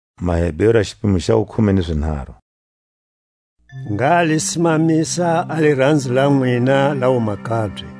A miphahlelo yi xalalisako Nungungulu. Ngha li simamisa a liranzo la nwina la wumakabye.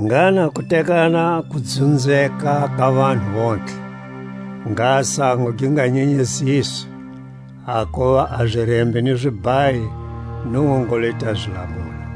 Ngha na kutekana ku dzunzeka ka vanhu vontlhe, ngha sango gi nga nyenyeziswi; hakuva a zirembi ni zibhayi Nungungulu i ta zi lamula.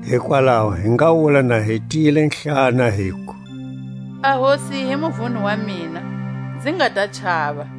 Hikwalaho hi nga wula na hi tiyilehlana, hiku: A Hosi hi muvuni wa mina, nzi nga ta chava;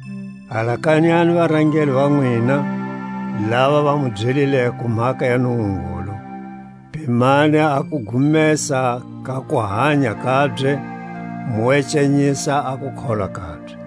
Alakanyani varangeli va nwina, lava va mu byelileko mhaka ya Nungungulu; pimani a kugumesa ka kuhanya kabye, mu ecanyisa a kukholwa kabye.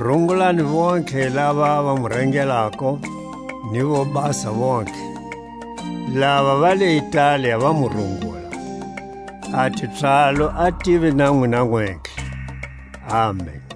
Rungulani vontlhe lava va mu rangelako, ni vobasa vontlhe. Lava va le Italia va mu rungula. A tipswalo a tive na nwina nwentlhe. Amen!